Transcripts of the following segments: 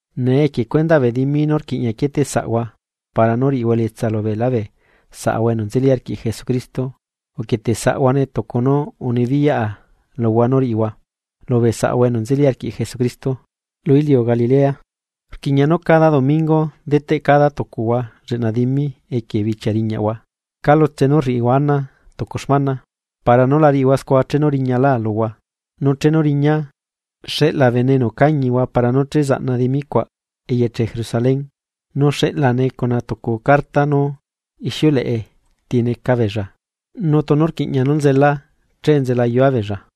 Nee equie cuendaꞌ bee dimi nú rquiꞌña quieteꞌsaꞌhua para nú riꞌihua elietsa lubeelá bee saꞌahua enu nzeli arquiꞌ Jesucristo, uquieteꞌsaꞌhuane tucu nú unibiyaꞌa luhua nú riꞌihua lubee saꞌahua enu nzeli arquiꞌ Jesucristo lu iliu Galilea. Rquiꞌña nú cada domingo deteꞌ cada tucuhua lleꞌna dimi equie bichia riñaꞌhua calutse nú uriꞌihua ana tucu xmana, para nú la riꞌihua scua chenu riñalá luhua. Nu chenu riñaa, xeꞌla bene enu cañihua para nú che zaꞌna dimi cuaꞌ eyeche Jerusalén, nu xeꞌlane cuna tucu carta nú ixiuleꞌe ti neca beella. Nu tunu rquiꞌña nú nzelaa, che nzelayua beella.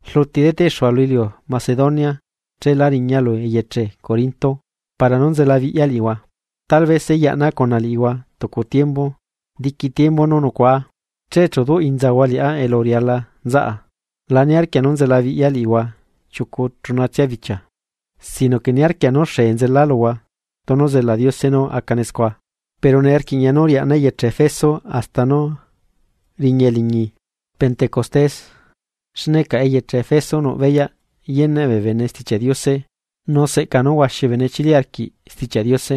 Rluti deteꞌxua lu iliu Macedonia chela riña lu eyeche Corinto para nú nzelabiꞌya liꞌihua. Talabese yaꞌna cuna liꞌihua tucu tiembu. Diqui tiembu nú nucuaa, che chu duꞌ inzahua liꞌá elu riala nzaꞌa. La niarquia nú nzelabiꞌya liꞌihua chiucu chunatsia bichia, sino que niarquia nú xee nzela luhua tunu zela Diose nú acane scua. Pero nee rquiꞌña nú riaꞌna eyeche Efeso hasta nú riña eliñi pentecostés. Xne caꞌa eyeche Efeso nuꞌ beyaꞌ yeneꞌ bee bene Stichiaꞌ Diose nu seꞌca nú huaxi bee bene chili arquiꞌ Stichiaꞌ Diose,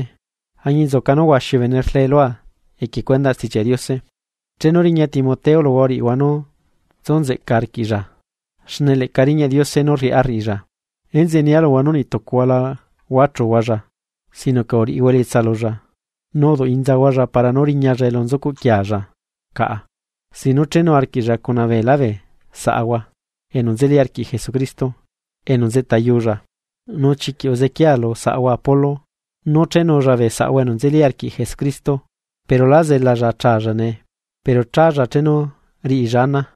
añinzuca nú huaxi bee bene rlee lua equie cuendaꞌ Stichiaꞌ Diose. Chenu riña Timoteo luhua uriꞌihua nú tsu nzeꞌca arquiꞌlla, xne leꞌca riñaꞌ Diose nú rriꞌá rriꞌilla. Enzeꞌe nia luhua nú niꞌtucuhua la huachuhualla, sino que uriꞌihua elietsa lulla, nu uduꞌ inzahualla para nú riñalla elu nzucuꞌquiealla caꞌa sin nú chenu arquiꞌlla cuna beelá bee saꞌahua enu nzeli arquiꞌ Jesucristo enu nzeꞌtayulla. Nu chiquiꞌ uzequiaa lu saꞌahua Apolo nú chenulla bee saꞌahua enu nzeli arquiꞌ Jesucristo, pero lá zelalla achalla nee, pero chálla chenu riꞌilla ana.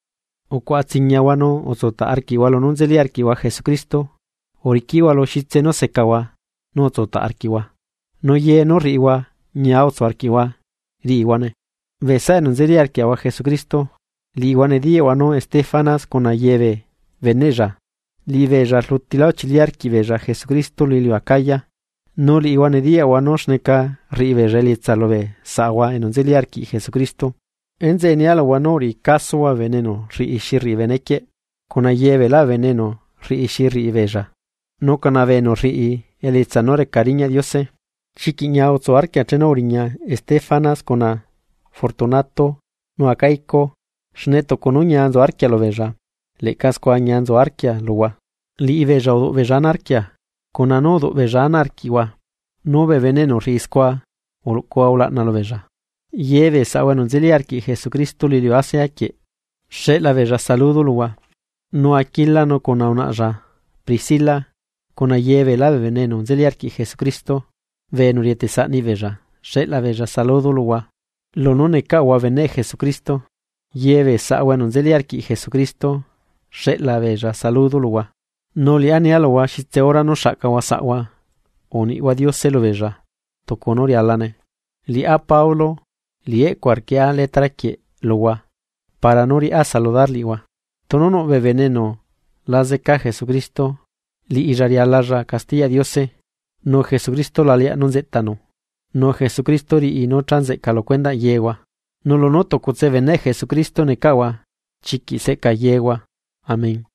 Ucuaꞌa tsiñiahua nu utsutaꞌ arquiꞌhua lunú nzeli arquiꞌhua Jesucristo. Uriquiꞌhua lu xitse nú secahua nu utsutaꞌ arquiꞌhua. Nu ye nú rriꞌihua ñia utsu arquiꞌhua riꞌihuane. Bee saꞌa enu nzeli arquiaꞌahua Jesucristo, liꞌihua nediyaꞌhua nú Estefanas cuna yebee beneꞌlla, liꞌibeella rlutilá uchili arquiꞌ beella Jesucristo lu iliu Acaya, nu liꞌihua nediyaꞌhua nú xneca rriꞌibeella elietsa lubee saꞌahua enu nzeli arquiꞌ Jesucristo. Enzeꞌe nia luhua nú uriꞌi casohua bee bene enu rriꞌi xi rriꞌi bee benequieꞌ cuna ye beelá bee bene enu rriꞌi xi rriꞌi beella, nu cuna bee enu rriꞌi elietsa nú reca riñaꞌ Diose. Chiquiꞌ ñia utsu arquia chenu uriña Estéfanas cuna Fortunato nu Acaico xne tucu nú ñia nzu arquia lubeella. Leꞌca scua ñia nzu arquia luhua. Liꞌibeella uduꞌbeella ana arquia cuna nú rduꞌbeella ana arquiꞌhua, nu bee bene enu rriꞌi scua uluꞌcuhua ulaꞌna lubeellla. Yebee saꞌahua enu nzeli arquiꞌ Jesucristo lu iliu Asia quieꞌ, xeꞌla beella saludo luhua. Nu Aquila nu cuna unaꞌlla Pricila cuna ye beelá bee bene enu nzeli arquiꞌ Jesucristo, bee enu rietesaꞌ niꞌbeella, xeꞌla beella saludo luhua lunú necaꞌahua beneꞌ Jesucristo. Ye bee saꞌahua enu nzeli arquiꞌ Jesucristo xeꞌla beella saludo luhua. Nu liꞌá nia luhua xitse hora nú xaꞌcahua saꞌhua, uniꞌhua Diose lubeella tucu nú rialane. Liꞌá Pablo, liꞌi eꞌcua rquieꞌa letra quieꞌ luhua para nú riꞌá saludar liꞌihua. Tunu nuꞌ bee bene enu la zeca Jesucristo, liꞌilla rialalla castiyaꞌ Diose. Nu Jesucristo la leaꞌ nú nzeꞌtanu. Nu Jesucristo riꞌi nú cha nzeꞌca lu cuendaꞌ yehua. Nu lunú tucutse beneꞌ Jesucristo necaꞌahua chiquiꞌ seꞌca yehua. Amén.